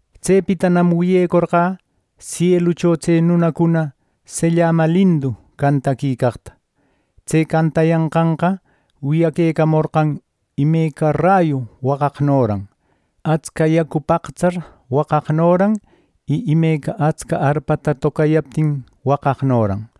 Tsepitanam wiyecorqä sielucho tse nunacuna sellama lindu cantaquicaqta. Tse cantayanqanqa wiyaquecamorqan imeca rayu waqaqnoran, atsca yacu paqtsar waqaqnoran y imeca atsca arpata tocayaptin waqaqnoran.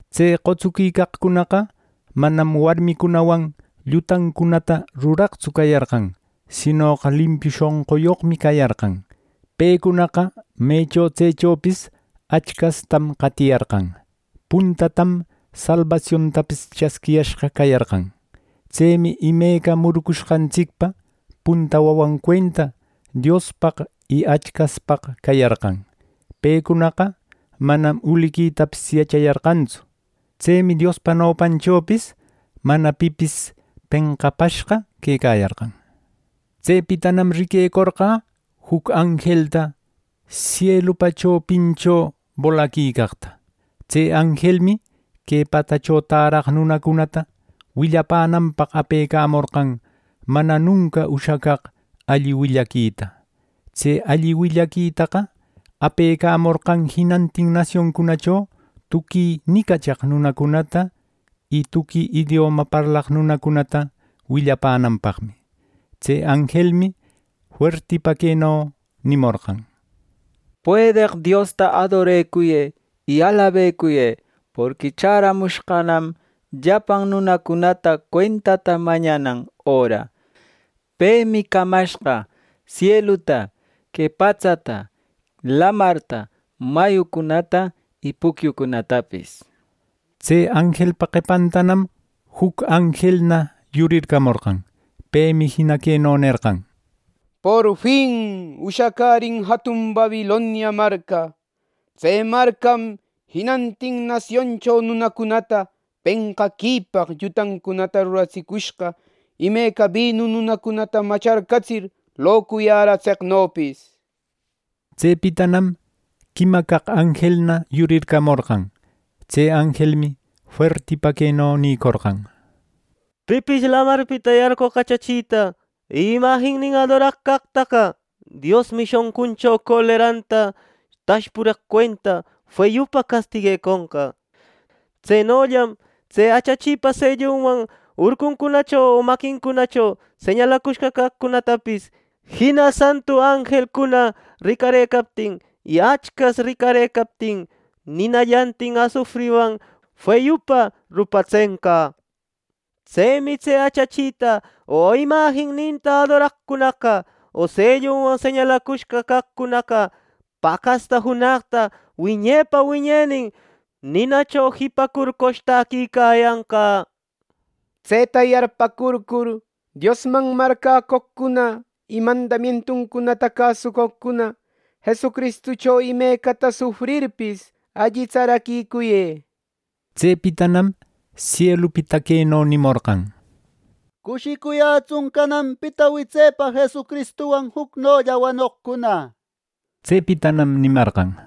Tse qotsuquicaqcunaqa manam warmicunawan llutancunata ruraqtsu cayarqan, sinoqa limpiu shonquyoqmi cayarqan. Pecunaqa mecho tsechopis Achcastam qatiyarqan. Puntatam salbasiontapis chasquiriyashqa cayarqan. Tsemi imeca murucushqantsicpa punta wawan cuenta Diospaq y Achcaspaq cayarqan. Pecunaqa manam uliquitapis yachayarqantsu. Tsemi Diospa nopanchopis mana pipis penqapashqa quecayarqan. Tsepitanam riquecorqä juc anjelta sielupa chopincho bolaquicaqta. Tse anjelmi que patsacho täraq nunacunata willapänanpaq apecamorqan mana nunca ushacaq alli willaquita. Tse alli willaquitaqa apecamorqan jinantin nasioncunacho tuqui nicachaq nunacunata, y tuqui idioma parlaq nunacunata willapänanpaqmi. Tse anjelmi fuertipa queno nimorqan: “Puedeq Diosta adorecuyë y alabecuyë, porqui chäramushqanam llapan nunacunata cuentata mañanan öra. Pemi camashqa sieluta, que patsata, lamarta, mayucunata y pucyucunatapis” nir. Tse anjelpa qepantanam juc anjelna yurircamorqan. Pemi jina queno nerqan: “¡Porfin ushacärin jatun Babilonia marca! Tse marcam jinantin nasioncho nunacunata penqaquipaq llutancunata ruratsicushqa imeca binu nunacunata macharcatsir locuyäratseqnopis” nir. Tsepitanam quima caq anjelna yurircamorqan. Tse anjelmi fuertipa queno nïcorqan: “Pipis Lamarpita yarqoq achachita y imajinninta adoraq caqtaqa, Diosmi shonquncho coleranta tashpureq cuenta feyupa castigueconqa. Tsenollam tse achachipa sellunwan urcuncunacho o maquincunacho señalacushqa caqcunatapis, jina santu anjelcuna ricarëcaptin, y Achcas ricarëcaptin ninallantin asufriwan feyupa rupatsenqa. Tsemi tse achachita o imajinninta adoraqcunaqa o sellunwan señalacushqa caqcunaqa paqasta junaqta wiñepa wiñenin ninacho jipacur qoshtäquicayanqa” nir. ¡Tseta yarpäcurcur Diosman marcäcoqcuna y mandamientuncunata cäsucoqcuna Jesucristucho imecata sufrirpis, alli tsaraquicuyë! Tsepitanam sielupita queno nimorqan: “Cushicuyätsun cananpita witsepa Jesucristuwan jucnolla wanoqcuna” nir. Tsepitanam nimarqan: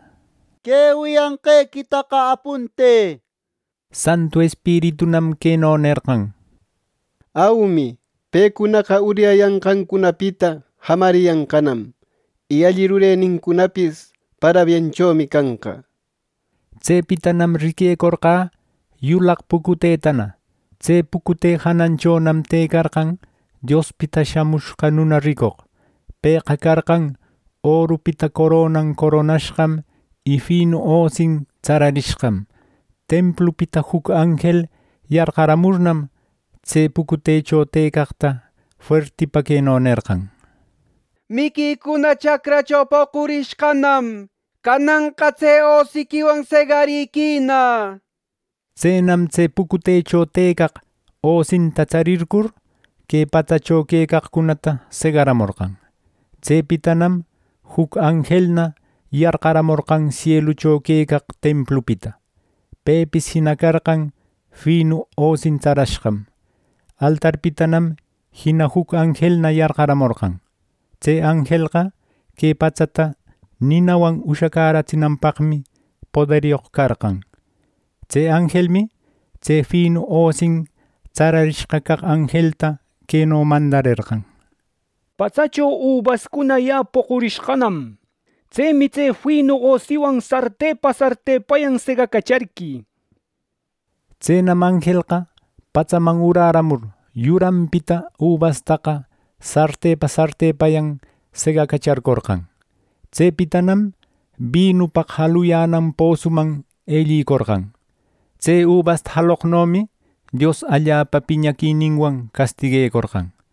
“Wiyanqequita apuntë” nir. Santu Espiritunam queno nerqan: “Aumi pecunaqa uryayanqancunapita jamariyanqanam. Y alli rurenincunapis parabienchomi canqa” nir. Tsepitanam riquecorqä yulaq pucutetana. Tse pucute jananchonam tëcarqan Diospita Shamushqa Nuna ricoq. Pëqa carqan orupita coronan coronashqam y finu osin tsararishqam. Templupita juc anjel yarqaramurnam, tse pucutecho tëcaqta fuertipa queno nerqan: “Miquicuna chacracho poqurishqanam. Cananqa tse osiquiwan segariquïna” nir. Tsenam tse pucutecho tëcaq, osinta tsarircur, que patsacho quecaqcunata segaramorqan. Tsepitanam juc anjelna yarqaramorqan sielucho quecaq templupita. Pepis jina carqan finu osin tsarashqam. Altarpitanam jina juc anjelna yarqaramorqan. Tse anjelqa que patsata ninawan ushacäratsinanpaqmi poderyoq carqan. Tse anjelmi tse finu osin tsararishqa caq anjelta queno mandarerqan: “Patsacho ubascuna ya poqurishqanam. Tsemi tse finu osiquiwan sartepa sartepayan segacacharquï” nir Tsenam anjelqa patsaman urärämur, yuranpita ubastaqa sartepa sartepayan segacacharcorqan. Tsepitanam binupaq jaluyänan posuman ellicorqan. Tse ubasta jaloqnomi Dios allapa piñaquininwan castiguecorqan.